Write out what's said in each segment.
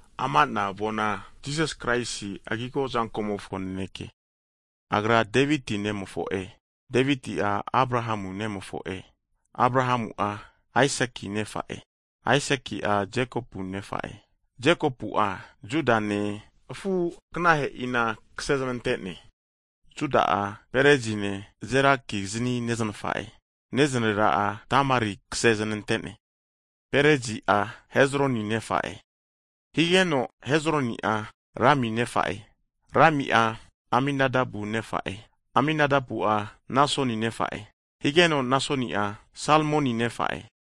Ama'na avona Jisas Kraisi agigo azankomofo naneke. Agra Deviti nagapinti fore higeno, Deviti'a Abrahamu nagapinti fore hu'ne. Abrahamu'a, Aisaki nefa'e, Aisaki'a Jekopu nefa'e, Jekopu'a, Judane afu'aganahe'ina kasezmante'ne. Juda'a, Perezine, Zerakizni neznafa'e, neznarera'a Tamari kasezanante'ne, Perezi'a, Hezroni nefa'e, higeno Hezroni'a, Rami nefa'e. Rami'a, Aminadabu nefa'e, Aminadabu'a, Nasoni nefa'e, higeno Nasoni'a, Salmoni nefa'e.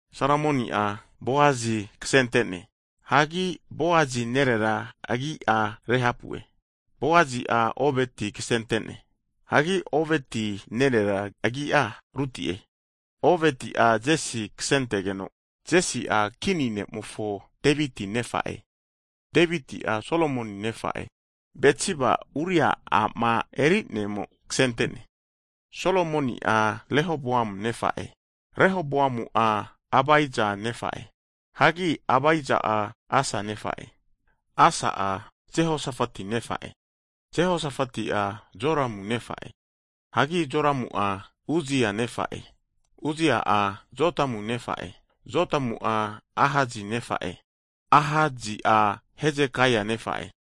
Salmoni'a Boasi kasente'ne. Hagi Boasi nerera agi'a Rehapu'e. Boasi'a Oveti kasente'ne. Hagi Oveti nerera agi'a Ruti'e. Oveti'a Jesi kasentegeno, Jesi'a, kini ne' Deviti nefa'e. Deviti'a Solomon nefa'e, Betsibama Uria a'ma eri'nea a'mo kasente'ne. Solomoni'a Rehoboam nefa'e, Rehoboamu'a Abija nefa'e, hagi Abija'a Asa nefa'e. Asa'a Jehosafati nefa'e, Jehosafati'a Joramu nefa'e, hagi Joramu'a, Uzia nefa'e. Uzia'a Jotamu nefa'e, Jotamu'a Ahasi nefa'e, Ahasi'a Hezekaia nefa'e.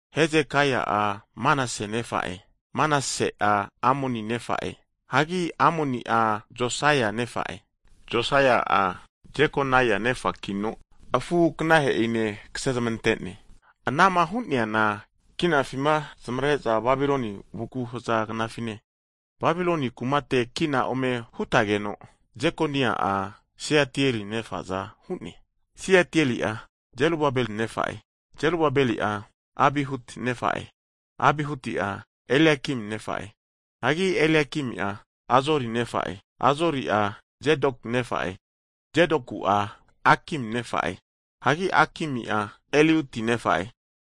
Hezekaia'a Manase nefa'e, Manase'a Amoni nefa'e, hagi Amoni'a Josaia nefa'e. Josaia'a Jekonaia nefakino, afu'aganahe'ine kase zamante'ne. Anama hu'neana kinafima zamavare'za Babiloni vuku haza knafine. Babilon kumate kina ome hutageno Jekonaia'a, Seatieli nefa'za hu'ne, Seatieli'a, Zerubabel nefa'e. Zerubabeli'a, Abihuti nefa'e, Abihuti'a, Eliakim nefa'e, hagi Eliakimi'a, Azori nefa'e. Azori'a, Zadoki nefa'e, Zadoku'a, Akimi nefa'e, hagi Akimi'a, Eliuti nefa'e.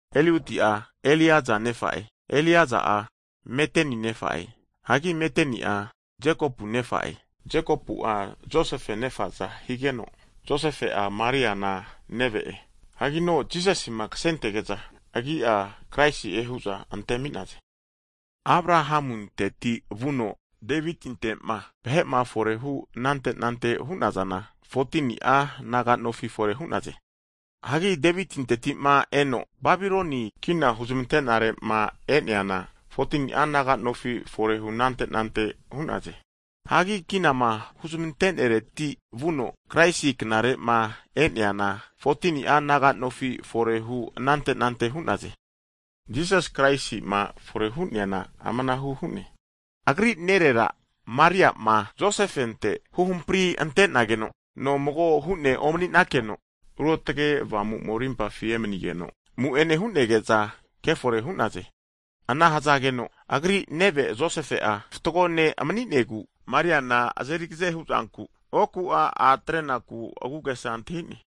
Eliuti'a, Eliaza nefa'e, Eliaza'a, Matani nefa'e, hagi Matani'a, Jekopu nefa'e. Jekopu'a, Josefe nefa'za higeno, Josefe'a Mariana neve'e. Hagino Jisasima kasentege'za, agi'a Kraisi'e hu'za antemi'naze. Abrahamunteti vuno Devitinte'ma vahe'ma forehu anante anante hu'nazana 14ni'a naga nofi fore hu'naze. Hagi Devitinteti'ma eno Babiloni kina huzmante'nare'ma e'neana 14ni'a naga nofi fore hunante anante hu'naze. Hagi kinama huzmante'nareti vuno Kraisi knare'ma e'neana 14ni'a naga nofi forehu'nante anante hu'naze. Jisasi Kraisi'ma fore hu'neana amanahu hu'ne, Agri nerera Mariana, Josefente huhampri ante'nageno, nomago hu'ne omani'nakeno, Ruotge Avamu'mo rimpafi emanigeno, amu'ene hu'nege'za kefore hu'naze. Ana hazageno, agri neve Josefe'a fatgo ne' mani'negu, Mariana azeri agaze hu'zanku, oku'a a' atrenaku agu'agesa antahi'ne.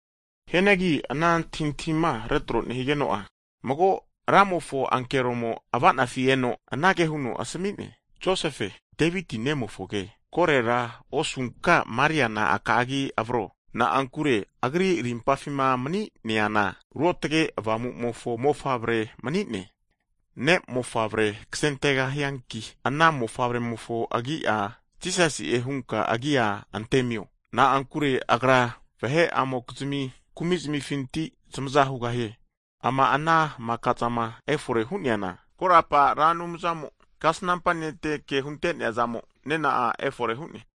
Hianagi ana antahintahima retro nehigeno'a, mago Ramofo ankeromo ava'nafi eno anage huno asmi'ne, Josefe, Deviti nemofoge, korera osunka Mariana aka'agi avro, na'ankure agri rimpafima mani'neana, Ruotge Avamu'mofo mofavre mani'ne. Ne'mofavre kasentegahianki, ana mofavremofo agi'a, Jisasi'e hunka agi'a antemio, na'ankure Agra vahe'amokizmi kumi'zmifinti zamaza hugahie. Ama ana maka'zama efore hu'neana, korapa Ra Anumzamo kasnampa ne'te ke hunte'nea zamo nena'a efore hu'ne.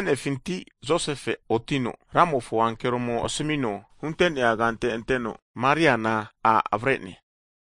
Mase'nefinti Josefe'a otino Ramofo ankeromo asmino hunte'nea kante anteno, Mariana a' avare'ne.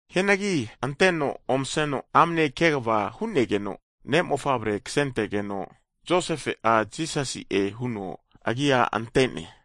Hianagi anteno omaseno amne kegava hu'negeno, ne'mofavre kasentegeno, Josefe'a, Jisasi'e huno agi'a ante'ne.